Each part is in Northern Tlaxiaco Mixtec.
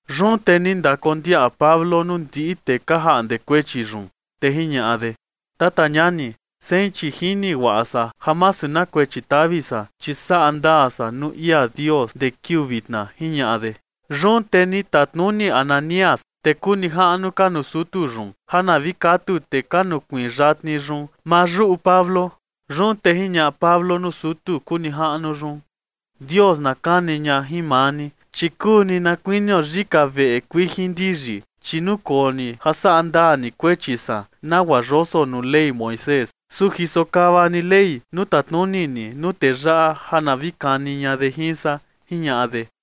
Yun te ni ndakondiaꞌa Pablo nuu ndiꞌi tee ka jaꞌnde kuechi yun, te jiñaꞌa de: ―Tata ñani, sein chi jini guaꞌa san ja masu na kuechi tavi san, chi saꞌa ndaa san nuu ia Dios ndee kiuu vitna ―jiñaꞌa de. Yun te ni tatnuni Ananías tee kuu nijaꞌnu ka nuu sutu yun ja na vi katu tee ka nukuiin yatni yun maa yuꞌu Pablo. Yun te jiñaꞌa Pablo nuu sutu kuu nijaꞌnu yun: ―Dios na kani ña jin maa ni, chi kuu ni na kuinio yika veꞌe kuijin ndiyi, chi nukoo ni ja saꞌa ndaa ni kuechi san nagua yoso nuu Ley Moisés, su jisokava ni Ley nuu tatnuni ni nuu tee yaꞌa ja na vi kani ña de jin san ―jiñaꞌa de.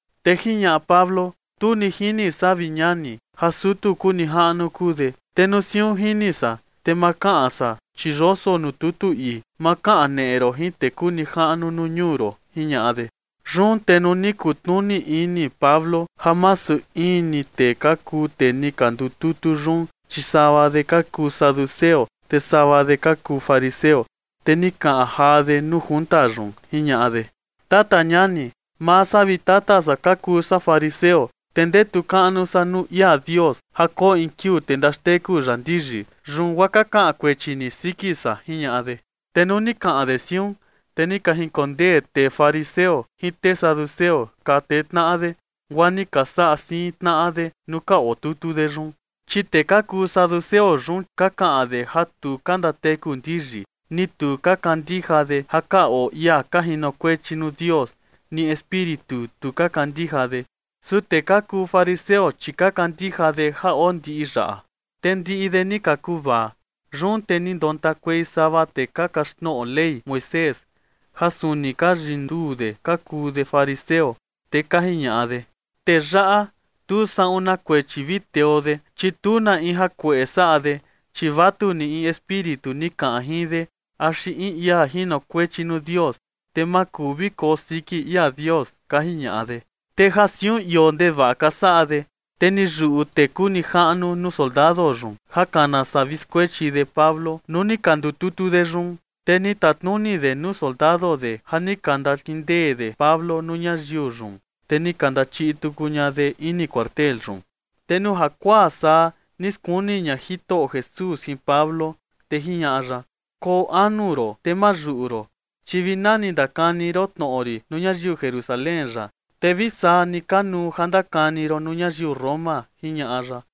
Te jiñaꞌa Pablo: ―Tu ni jini san, vi ñani, ja sutu kuu nijaꞌnu kuu de. Te nuu siun jini san, te ma kaꞌan san, chi yoso nuu tutu ii: “Ma kaneꞌe ron jin tee kuu nijaꞌnu nuu ñuu ron” ―jiñaꞌa de. Yun te nuu ni kutnuni ini Pablo ja masu in ni tee ka kuu tee ni ka ndututu yun, chi sava de ka kuu saduceo, te sava de ka kuu fariseo, te ni kaꞌan jaa de nuu tee ka ndututu yun, jiñaꞌa de: ―Tata ñani, maa san vi tata san ka kuu san fariseo, te ndetu kaꞌnu san nuu ia Dios ja koo in kiuu te ndaxteku ya ndiyi, yun guaa ka kaꞌan kuechi ni siki san ―jiñaꞌa de. Te nuu ni kaꞌan de siun, te ni ka jinkondee tee fariseo jin tee saduceo ka tee tnaꞌa de, guaa ni ka saꞌa siin tnaꞌa de nuu ka otutu de yun. Chi tee ka kuu saduceo yun ka kaꞌan de ja tu ka ndateku ndiyi, ni tu ka kandija de ja ka oo ia ka jinokuechi nuu Dios, ni espíritu tu ka kandija de. Su tee ka kuu fariseo, chi ka kandija de ja oo ndiꞌi yaꞌa. Te ndiꞌi de ni ka kuvaa. Yun te ni ndontakuei sava tee ka kaxtnoꞌo Ley Moisés, ja suni ka yiunduu de ka kuu de fariseo, te ka jiñaꞌa de: ―Tee yaꞌa, tu saꞌun na kuechi vi teo de, chi tu na in jakueꞌe saꞌa de, chi vatu ni, in espíritu ni kaꞌan jin de axi in ia jinokuechi nuu Dios, te ma kuu vi koo siki ia Dios ―ka jiñaꞌa de. Te ja siun ioo ndevaꞌa ka saꞌa de, te ni yuꞌu tee kuu nijaꞌnu nuu soldado yun ja kana saa vi skuechi de Pablo nuu ni ka ndututu de yun. Te ni tatnuni de nuu soldado de ja ni ka ndakindee de Pablo nuu ñayiu yun, te ni ka ndachiꞌi tuku ña de ini cuartel yun. Te nuu jakuaa saa ni skuni ña Jitoꞌo Jesús jin Pablo, te jiñaꞌa ya: ―Koo anu ron te ma yuꞌu ron, chi vi nani ni ndakani ron tnoꞌo rin nuu ñayiu Jerusalén yaꞌa, te vi saa ni kanuu ja ndakani ron nuu ñayiu Roma ―jiñaꞌa ya.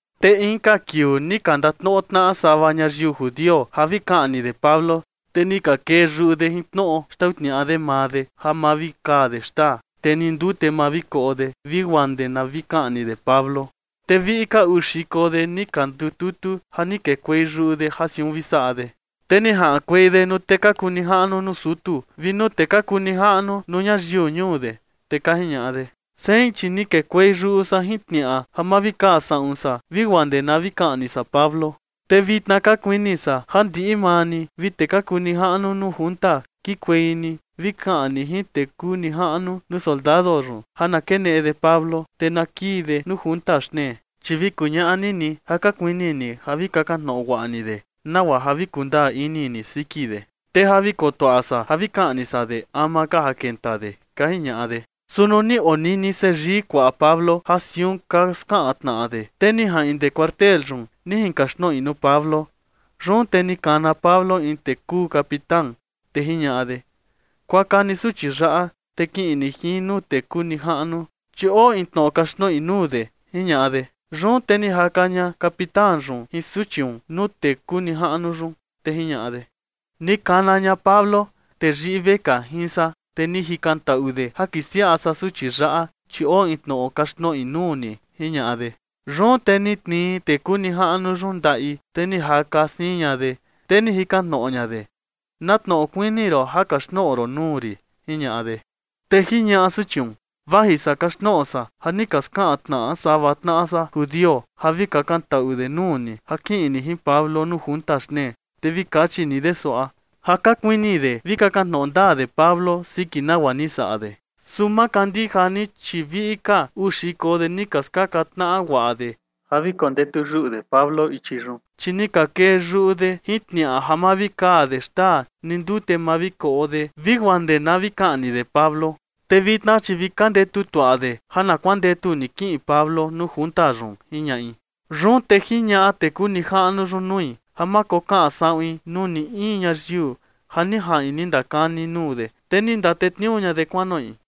Te inka kiuu ni ka ndatnoꞌo tnaꞌa sava ñayiu judio ja vi kaꞌni de Pablo. Te ni ka kee yuꞌu de jin tnoꞌo xtau tniaꞌa de maa de, ja ma vi kaa de xtaa, te ni ndute ma vi koꞌo de vi guaa ndee na vi kaꞌni de Pablo. Te viꞌi ka uu xiko de ni ka ndututu ja ni kekuei yuꞌu de ja siun vi saꞌa de. Te ni jaꞌankuei de nuu tee ka kuu nijaꞌnu nuu sutu vi nuu tee ka kuu nijaꞌnu nuu ñayiu ñuu de, te ka jiñaꞌa de: ―Sein, chi ni kekuei yuꞌu san jin tniaꞌa ja ma vi kaa saꞌun san vi guaa ndee na vi kaꞌni san Pablo. Te vitna ka kuini san ja ndiꞌi maa ni vi tee ka kuu nijaꞌnu nuu junta kiꞌinkuei ni vi kaꞌan ni jin tee kuu nijaꞌnu nuu soldado yun ja na keneꞌe de Pablo, te na kii de nuu vi ndututu de xtnee, chi vi kuñaꞌa ni ni ja ka kuini ni ja vi kakan tnoꞌo guaꞌa ni de, nagua ja vi kundaa ini ni siki de. Te ja vi kotuaꞌa san ja vi kaꞌni san de ama ka ja kenta de ―ka jiñaꞌa de. Su nuu ni onini seyii kuaꞌa Pablo ja siun ka skaꞌan tnaꞌa de, te ni jaꞌin ndee cuartel yun ni jinkaxtnoꞌi nuu Pablo. Yun te ni kana Pablo in tee kuu capitán, te jiñaꞌa de: ―Kuaka ni suchi yaꞌa, te kiꞌin ni jin nuu tee kuu nijaꞌnu, chi oo in tnoꞌo kaxtnoꞌi nuu de ―jiñaꞌa de. Yun te ni jaka ña capitán yun jin suchiun nuu tee kuu nijaꞌnu yun, te jiñaꞌa de: ―Ni kana ña Pablo, tee yiꞌi vekaa jin san, te ni jikantaꞌu de ja kisiaꞌa san suchi yaꞌa, chi oo in tnoꞌo kaxtnoꞌi nuu ni ―jiñaꞌa de. Yun te ni tnii tee kuu nijaꞌnu yun ndaꞌi, te ni jaka siin ña de, te ni jikan tnoꞌo ña de: ―¿Na tnoꞌo kuini ron ja kaxtnoꞌo ron nuu rin? ―jiñaꞌa de. Te jiñaꞌa suchiun: ―Vaji san kaxtnoꞌo san ja ni ka skaꞌan tnaꞌa sava tnaꞌa san judio ja vi kakantaꞌu de nuu ni ja kiꞌin ni jin Pablo nuu junta xtnee, te vi kachi ni de suaꞌa, ja ka kuini de vi kakan tnoꞌo ndaa de Pablo siki nagua ni saꞌa de. Su ma kandija ni, chi viꞌi ka uu xiko de ni ka skaka tnaꞌa guaꞌa de ja vi kondetu yuꞌu de Pablo ichi yun, chi ni ka kee yuꞌu de jin tniaꞌa ja ma vi kaa de xtaa ni ndute ma vi koꞌo de vi guaa ndee na vi kaꞌni de Pablo. Te vitna, chi vi ka ndetu tuaꞌa de ja na kuandetu ni kiꞌin Pablo nuu junta yun ―jiñaꞌi. Yun te jiñaꞌa tee kuu nijaꞌnu yun nui ja ma kokaꞌan saꞌuin nuu ni in ñayiu ja ni jaꞌin ni ndakani nuu de. Te ni ndatetniuu ña de kuanoꞌi.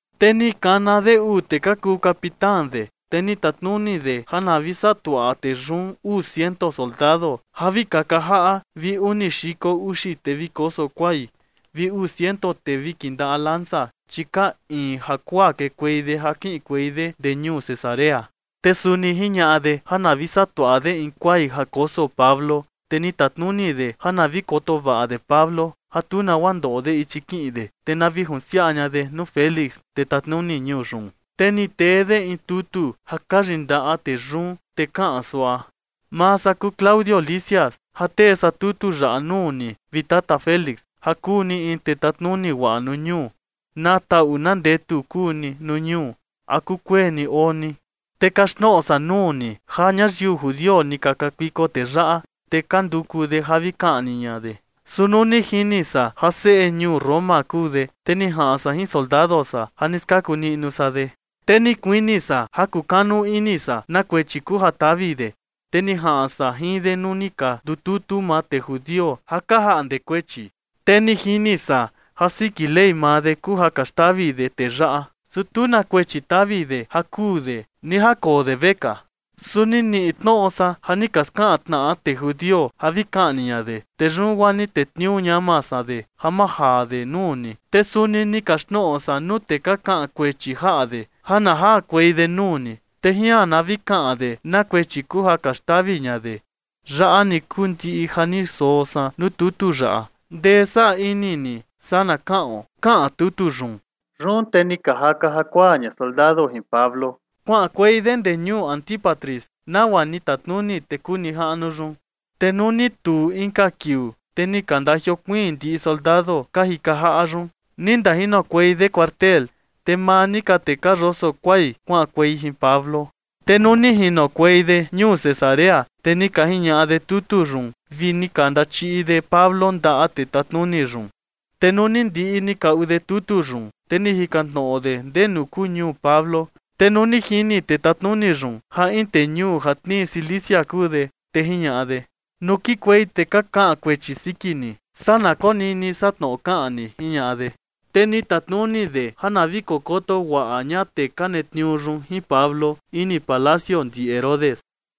Te ni kana de uu tee ka kuu capitán de, te ni tatnuni de ja na vi saꞌa tuaꞌa tee yun uu ciento soldado ja vi kaka jaꞌa vi uni xiko uxi tee vi koso kuai vi uu ciento tee vi kindaꞌa lanza, chi ka iin jakuaa kekuei de ja kiꞌinkuei de ndee ñuu Cesarea. Te suni jiñaꞌa de ja na vi saꞌa tuaꞌa de in kuai ja koso Pablo, te ni tatnuni de ja na vi koto vaꞌa de Pablo, ja tu nagua ndoꞌo de ichi kiꞌin de, te na vi junsiaꞌa ña de nuu Félix, tee tatnuni ñuu yun. Te ni tee de in tutu ja ka yindaꞌa tee yun, te kaꞌan suaꞌa: “Maa san kuu Claudio Lisias ja tee san tutu yaꞌa nuu ni, vi tata Félix, ja kuu ni in tee tatnuni guaꞌa nuu ñuu. Na taꞌu na ndetu kuu ni nuu ñuu. ¿A kukueni oo ni? Te kaxtnoꞌo san nuu ni ja ñayiu judio ni ka kakuiko tee yaꞌa, te ka nduku de ja vi kaꞌni ña de. Su nuu ni jini san ja seꞌe ñuu Roma kuu de, te ni jaꞌan san jin soldado san ja ni skaku niꞌnu san de. Te ni kuini san ja kukanu ini san na kuechi kuu ja tavi de. Te ni jaꞌan san jin de nuu ni ka ndututu maa tee judio ja ka jaꞌnde kuechi. Te ni jini san ja siki Ley maa de kuu ja ka xtavi de tee yaꞌa, su tu na kuechi tavi de ja kuu de ni ja koo de vekaa. Su ni niꞌi tnoꞌo san ja ni ka skaka tnaꞌa tee judio ja vi kaꞌni ña de. Te yun guaa ni tetniuu ñama san de ja majaa de nuu ni. Te suni ni kaxtnoꞌo san nuu tee ka kaꞌan kuechi jaꞌa de ja na jakuei de nuu ni, te jian na vi kaꞌan de na kuechi kuu ja ka xtavi ña de. Yaꞌa ni kuu ndiꞌi ja ni soo san nuu tutu yaꞌa. Ndee saa ini ni, saa na kaꞌon”, kaꞌan tutu yun. Yun te ni ka jaka jakuaa ña soldado jin Pablo kuaꞌankuei de ndee ñuu Antípatris, nagua ni tatnuni tee kuu nijaꞌnu yun. Te nuu ni tuu inka kiuu, te ni ka ndajiokuiin ndiꞌi soldado ka jika jaꞌa yun ni ndajinokuei de cuartel, te maa ni ka tee ka yoso kuai kuaꞌankuei jin Pablo. Te nuu ni jinokuei de ñuu Cesarea, te ni ka jiñaꞌa de tutu yun vi ni ka ndachiꞌi de Pablo ndaꞌa tee tatnuni yun. Te nuu ni ndiꞌi ni kaꞌu de tutu yun, te ni jikan tnoꞌo de ndenu kuu ñuu Pablo. Te nuu ni jini tee tatnuni yun ja in tee ñuu ja tnii Cilicia kuu de, te jiñaꞌa de: ―Nuu kikuei tee ka kaꞌan kuechi siki ni, saa na konini san tnoꞌo kaꞌan ni ―jiñaꞌa de. Te ni tatnuni de ja na vi kokoto guaꞌa ña tee ka netniuu yun jin Pablo ini palacio ndi Herodes.